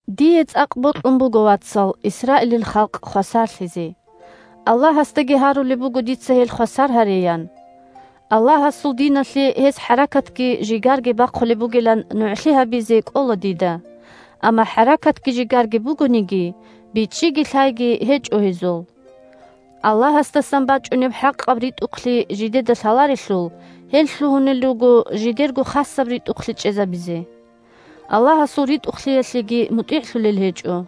Дие цӀакъ бокьун буго, вацал, Исраилил халкъ хвасарлъизе. Аллагьасдаги гьарулеб буго дица гьел хвасар гьареян. Аллагьасул диналъе гьез хӀаракатги жигарги бахъулеб бугилан нугӀлъи гьабизе кӀола дида, амма хӀаракатги жигарги бугониги, бичӀчӀиги лъайги гьечӀо гьезул. Аллагьасдасан бачӀунеб хӀакъаб ритӀухълъи жидеда лъаларелъул, гьел лъугьунел руго жидерго хасаб ритӀухълъи чӀезабизе. Аллагьасул ритӀухълъиялъеги мутӀигӀлъулел гьечӀо.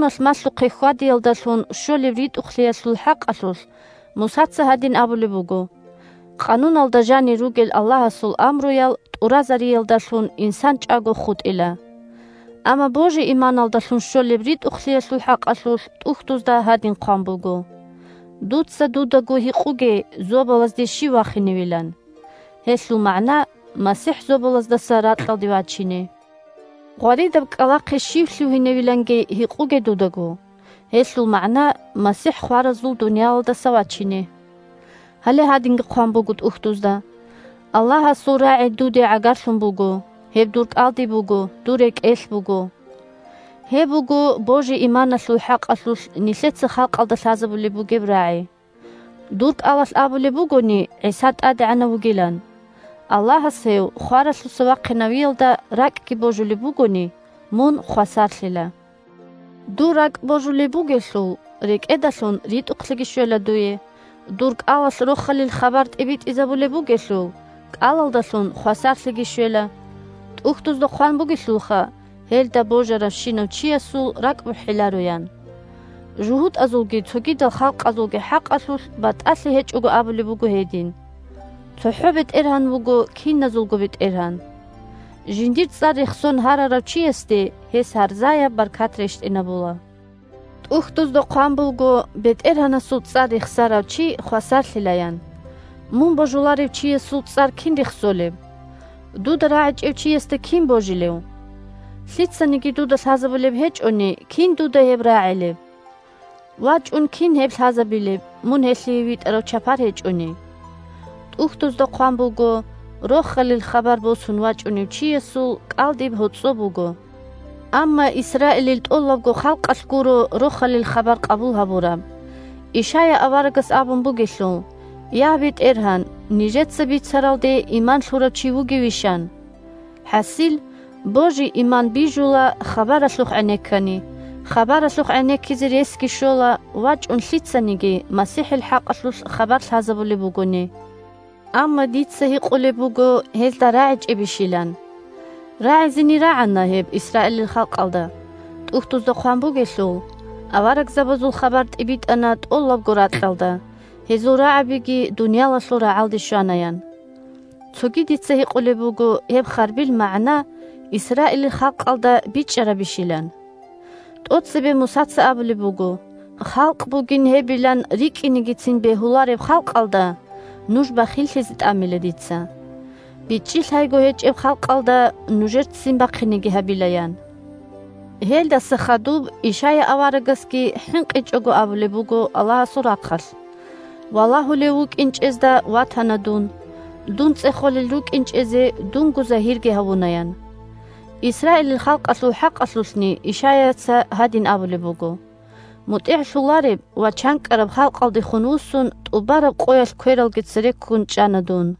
Къануналъ малъухъе хьвадиялдалъун щолеб ритӀухълъиялъул хӀакъалъулъ Мусаца гьадин абулеб буго: «Къануналда жанир ругел Аллагьасул амруял тӀуразариялдалъун инсан чӀаго хутӀила». Амма божи-иманалдалъун щолеб ритӀухълъиялъул хӀакъалъулъ ТӀухьдузда гьадин хъван буго: «Дуца дудаго гьикъуге зобалазде щив вахиневилан?» (Гьелъул магӀна – МасихӀ зобалаздаса ракьалде вачине.) «Гъваридаб кӀкӀалахъе щив лъугьиневиланги» гьикъуге дудаго. (Гьелъул магӀна – МасихӀ хваразул дуниялалдаса вачине.) Гьале гьадинги хъван буго ТӀухьдузда: «Аллагьасул рагӀи дуде гӀагарлъун буго. Гьеб дур кӀалдиб буго, дур рекӀелъ буго». Гьеб буго божи-иманалъул хӀакъалъулъ нилъеца халкъалда лъазабулеб бугеб рагӀи. Дур кӀалалъ абулеб бугони ГӀиса ТӀадегӀанав вугилан, Аллагьас гьев хваралъуса вахъинавиялда ракӀги божулеб бугони, мун хвасарлъила. Дур ракӀ божулеб бугелъул, рекӀедалъун ритӀухълъиги щвела дуе, дур кӀалалъ Рохалил хабар тӀибитӀизабулеб бугелъул, кӀалалдалъун хвасарлъиги щвела. ТӀухьдузда хъван бугелъулха: «Гьелда божаравщинав чиясул ракӀбухӀиларо», – ян. ЖугьутӀазулги цогидал халкъазулги хӀакъалъулъ батӀалъи гьечӀого абулеб буго гьедин. ЦохӀо БетӀергьан вуго киназулго БетӀергьан. Жиндир цӀар рехсон гьарарав чиясде гьес гьарзаяб баркат рещтӀинабула. ТӀухьдузда хъван буго: «БетӀергьанасул цӀар рехсарав чи хвасарлъила», – ян. Мун божуларев чиясул цӀар кин рехсолеб? Дуда рагӀичӀев чиясда кин божилев? Лъицаниги дуда лъазабулеб гьечӀони, кин дуда гьеб рагӀилеб? ВачӀун кин гьеб лъазабилеб, мун гьелъие витӀарав чапар гьечӀони? ТӀухьдузда хъван буго: «Рохалил хабар босун вачӀунев чиясул кӀалдиб гьоцӀо буго!» Амма Исраилил тӀолабго халкъалъ гуро Рохалил хабар къабул гьабураб. Ишая аварагас абун бугелъул: «Я, БетӀергьан, нижеца бицаралде иман лъурав чи вугевищ?» – ан. ХӀасил, божи-иман бижула хабаралъухъ гӀенеккани, хабаралъухъ гӀенеккизе ресги щола вачӀун лъицаниги МасихӀил хӀакъалъулъ хабар лъазабулеб бугони. Амма дица гьикъулеб буго гьезда рагӀичӀебищилан. РагӀизени рагӀана гьеб Исраилил халкъалда. ТӀухьдузда хъван бугелъул: «Аварагзабазул хабар тӀибитӀана тӀолабго ракьалда, гьезул рагӀабиги дуниялалъул рагӀалде щвана», – ян. Цоги дица гьикъулеб буго гьеб харбил магӀна Исраилил халкъалда бичӀчӀарабищилан. ТӀоцебе Мусаца абулеб буго: «Халкъ бугин гьебилан рикӀкӀинегицин бегьулареб халкъалда нуж бахиллъизе тӀамила дица. БичӀчӀи-лъайго гьечӀеб халкъалда нужер ццин бахъинеги гьабила», – ян. Гьелдаса хадуб Ишая аварагасги хӀинкъичӀого абулеб буго Аллагьасул рахъалъ: «Валагьулев вукӀинчӀезда ватана дун. Дун цӀехолел рукӀинчӀезе дунго загьирги гьавуна», – ян. Исраилил халкъалъул хӀакъалъулъни Ишаяца гьадин абулеб буго: «МутӀигӀлъулареб ва чанкӀкӀараб халкъалдехун вуссун тӀубараб къоялъ квералги цере ккун чӀана дун».